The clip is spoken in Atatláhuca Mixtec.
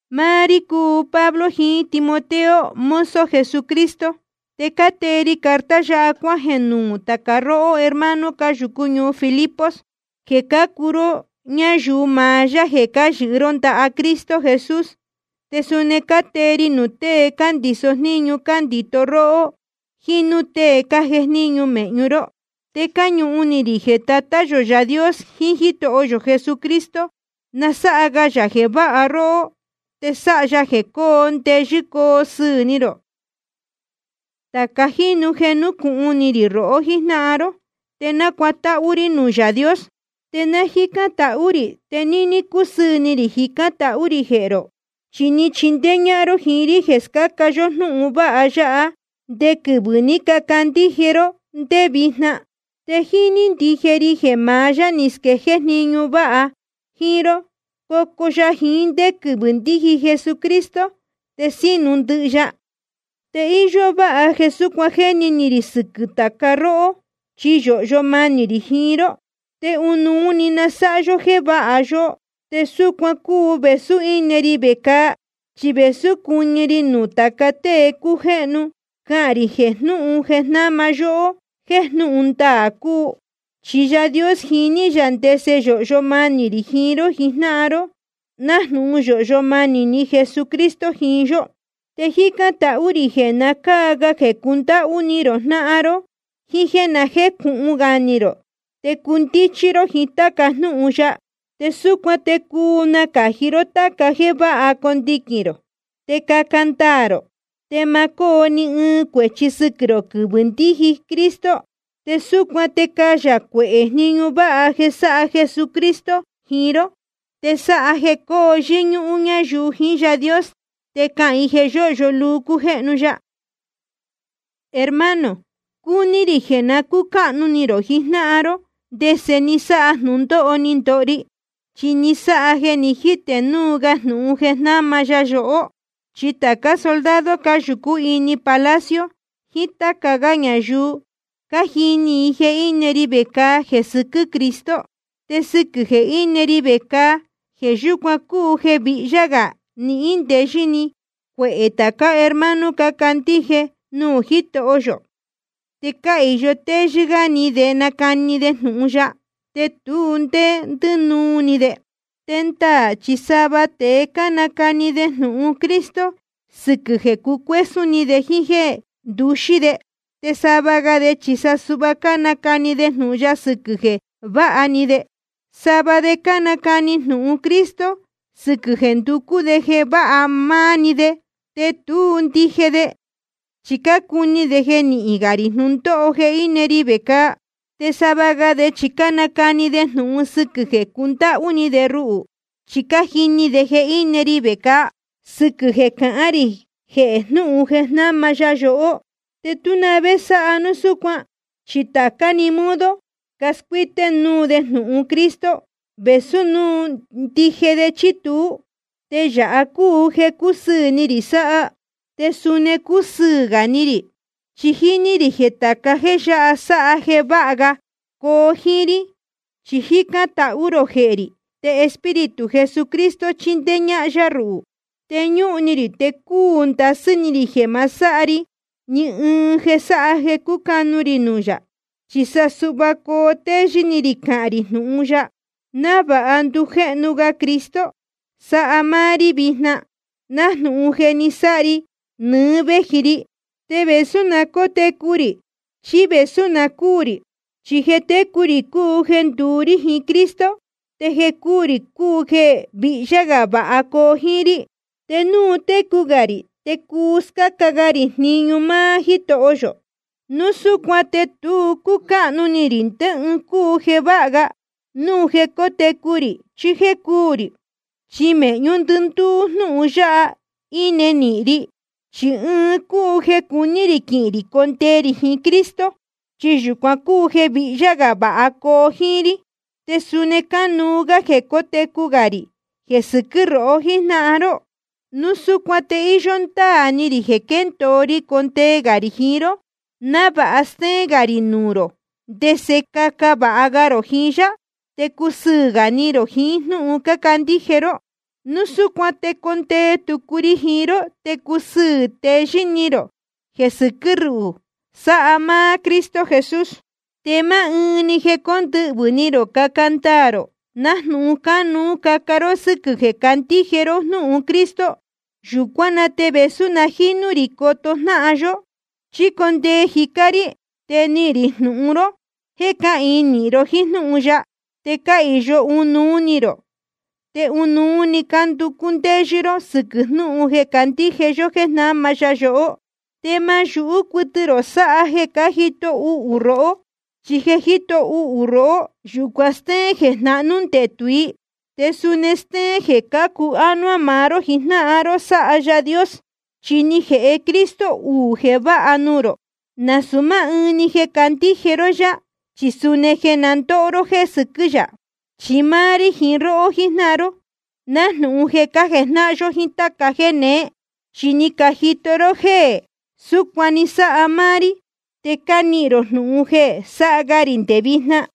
Máá rí cúu Pablo jiín Timoteo, mozo Jesucristo. Te cátee ri carta yáha cuájeē nuū tāca róhó hermano cáyūcú ñuu Filipos, jeē cácuu ró ñáyuu maá yá jeē cáyɨhɨ ró ndaha Cristo Jesús. Te suni cátee ri nuū tée cándiso jníñu cándito róhó, jíín núū tēe cájejníñu mēhñu ró. Te cáñuhun ni rī jeē Tatá yō Yaā Dios jiín Jítoho yō Jesucristo, na sáha ga yā jeē váha róhó, te sáha ya jeē coo ndeyɨ́ coo sɨɨ̄ ni rō. Tāca jínu jeē núcūhun ni rī rohó jíjnáhan ró, te nácuatáhú rí nuū Yaā Dios. Te náa jícán tahú rī, te níní cúsɨɨ̄ ni rī jicán tahú rī jehē rō. Chi ni chindéé ñájnáhan ró jíín rí jeē scáca yó jnúhun vāha ya, nde quɨvɨ̄ ní cacandíje ró te nde vijna. Te jíní ndije ri jeē maá Yaā ní squéjéé jniñu váha jíín ró, cocu ya jiín ndé quɨvɨ̄ ndíji Jesucristo, te sínu ndɨhɨ ya. Te íyó váha jeē súcuan jéni ni rī sɨquɨ̄ tāca róhó, chi yōhyo manī rī jiín ró, te ɨnuú‑ni ni sáha ya jeē váha yóhó. Te súcuan cúu vēsú íne ri vecāa chí vēsú cuɨñɨ ri nuū tāca tée cújéhnu, cahān rī jehē jnúhun jeē jnáma ya yohó jéē jnūhun ndaā cúu. Chi Yaā Dios jiní yā ndese yōhyo manī rī jiín ró jijnáhan ró, nájnūhun yōhyo manī Jesucristo jiín yó. Te jícán tahú rī jeē na cáa ga jeē cundáhú ni rō jnáhan ró, jiín jéē na jécūhun ga ni rō te cundíchí ró jiín táca jnúhun ya. Te súcuan te cuu nacāji ró táca jéē váha condiquīn rō, te caca ndaā rō, te ma cóo ni ɨɨn cuēchi sɨquɨ̄ rō quɨvɨ̄ ndíji Cristo. Te súcuan te cayā cuehē jniñu váha jeē sáha Jesucristo jiín ró. Te sáha jeē coo yɨ́ñúhún ñáyuu jiín Yaā Dios te cahān i jeē yóhyo luu cújéhnu ya. Hermano, cúní rī jeē na cúcáhnu ni rō jijnáhan ró ndese ni sáha jnūndóho ni ndoho ri. Chi ni sáha jeē ni jítē núu ga jnūhun jeē jnáma ya yohó. Chi tācá soldado cáyūcú ini palacio, jiín táca gá ñayuu, cájini i jeē íne ri vecāa jeē sɨquɨ́ Cristo. Te sɨquɨ̄ jeē íne ri vecāa, jeē yúcuan cúu jeē vihyá gā nihín ndeyɨ́ ni cuehē tācá hermano cácandíje nuū Jítoho yō. Te cáhīyo téyɨ́ gá ni de nácani de jnūhun ya, te tu ndé ndínuu ni de. Te ndaā chi sava tēe cánacani de jnūhun Cristo sɨquɨ̄ jeē cuesún ni de jíín jéē nduxí de. Te sava ga de chi sa suhva cánacani de jnūhun ya sɨquɨ̄ jeē váha ni de. Sava de cánacani jnūhun Cristo sɨquɨ̄ jeē nducú de jeē váha máá‑ni de, te tú ndije de, chi cácuni de jeē nihīn gā rī jnūndóho jeē íne ri vecāa. Te sava ga de chi cánacani de jnūhun sɨquɨ̄ jeē cundáhú ni de ruhū, chi cájini de jeē íne ri vecāa sɨquɨ̄ jeē cahán rī jehē jnúhun jeē jnáma ya yohó. Tú na vé sáha núu súcuan, chi tācá‑ni modo cascuíté núu de jnūhun Cristo, vēsú núu ndije de chí tuú. Te yāha cúu jeē cúsɨɨ̄ ni rī sáha. Te suni cusɨɨ̄ gā ni rī, chi jíní rī jeē tāca jéē yáha sáha jeē váha ga coo jíín rí, chi cájicān tahú rō jehē rī, te Espíritu Jesucristo chíndéé ñáhán yá ruhū. Chi ñúhun ni rī te cúu ndasɨ́ ni rī jeē ma sáha ri ni ɨɨn jeē sáha jeē cucanu ri nuū yā. Chi sa suhva coo téyɨ́ ni rī cahān rī jnūhun ya, návāha ndujéhnu ga Cristo sáha máá rí vijna, nájnūhun je ni sáha ri nɨɨ́ véji ri, te vēsú na cótecu rī chí vēsú na cúū rī. Chi jeē técu rī cúu jeē nduú rí jiín Cristo, te jeē cúū rī cúu jeē vihyá gā vāha coo jíín rí. Te núu cotecu gā rī, te cuu scáca ga rī jniñu máá Jítoho yō. Núu súcuan te tu cúcáhnu ni rī ndé ɨɨn cúu jeē váha ga, núu jeē cótecu rī chí jéē cúū rī. Chi mēhñú ndɨndúú jnúhun yáha íne nīhin ri. Chi ɨɨn cúu jeē cuní rī quihīn rī condee rī jiín Cristo, chi yūcuan cúu jeē vihyá gā vāha coo jíín rí. Te suni cánuú gá jeē cótecu gā rī jeē sɨquɨ́ rohó jíjnáhan ró. Núu súcuan te íyó ndáā ni rī jeē quéndōo ri condee gā rī jiín ró, návāha stéén gā rī nuū rō ndese caca vāha ga rō jiín yá, te cusɨɨ̄ gā ni rō jiín jnúhun cácandíje ró. Núu súcuan te condee tucu ri jiín ró, te cusɨɨ̄ teyɨ́ ni rō jeē sɨquɨ́ ruhū, sáha máá Cristo Jesús. Te máá ɨɨn‑ni jeē condɨhvɨ̄ ni rō caca ndaā rō, nájnūhun cánuú caca ró sɨ́quɨ̄ jeē cácandíje ró jnúhun Cristo. Yūcuán na te vēsú na jínú rī coto jnáhan yó, chí condee jicá rí, te nihīn rī jnūhun ro jéē cáhīin nīhin ró jíín jnúhun ya, te cáhīyo ɨnuú ni rō, te ɨnuú‑ni cánducú ndéyɨ́ ró sɨquɨ̄ jnúhun jeē cácandíje yó jéē jnáma ya yohó. Te ma yūhú cuɨtɨ rō sáha jeē cájito uhū rohó. Chi jeē jíto uhū i róhó, yūcuan stéén jeē jnahnú ndetū i, te suni stéén jeē cācu ánuá maá ró jijnáhan ró sáha Yaā Dios. Chi ni jēhe Cristo uū jeē váha nuū rō: nasūu máá ɨɨn‑ni jeē candíje ró yá, chi suni jeē na ndóho ró jéē sɨquɨ́ yā. Chi máá rí jiín róhó jijnáhan ró, nájnūhun jeē cájejnáhan yó jíín táca jéē neé. Chi ni cajito ró jéē súcuan ni sáha máá rí, te cánihīn rō jnūhun jeē sáha ga rī nde vijna.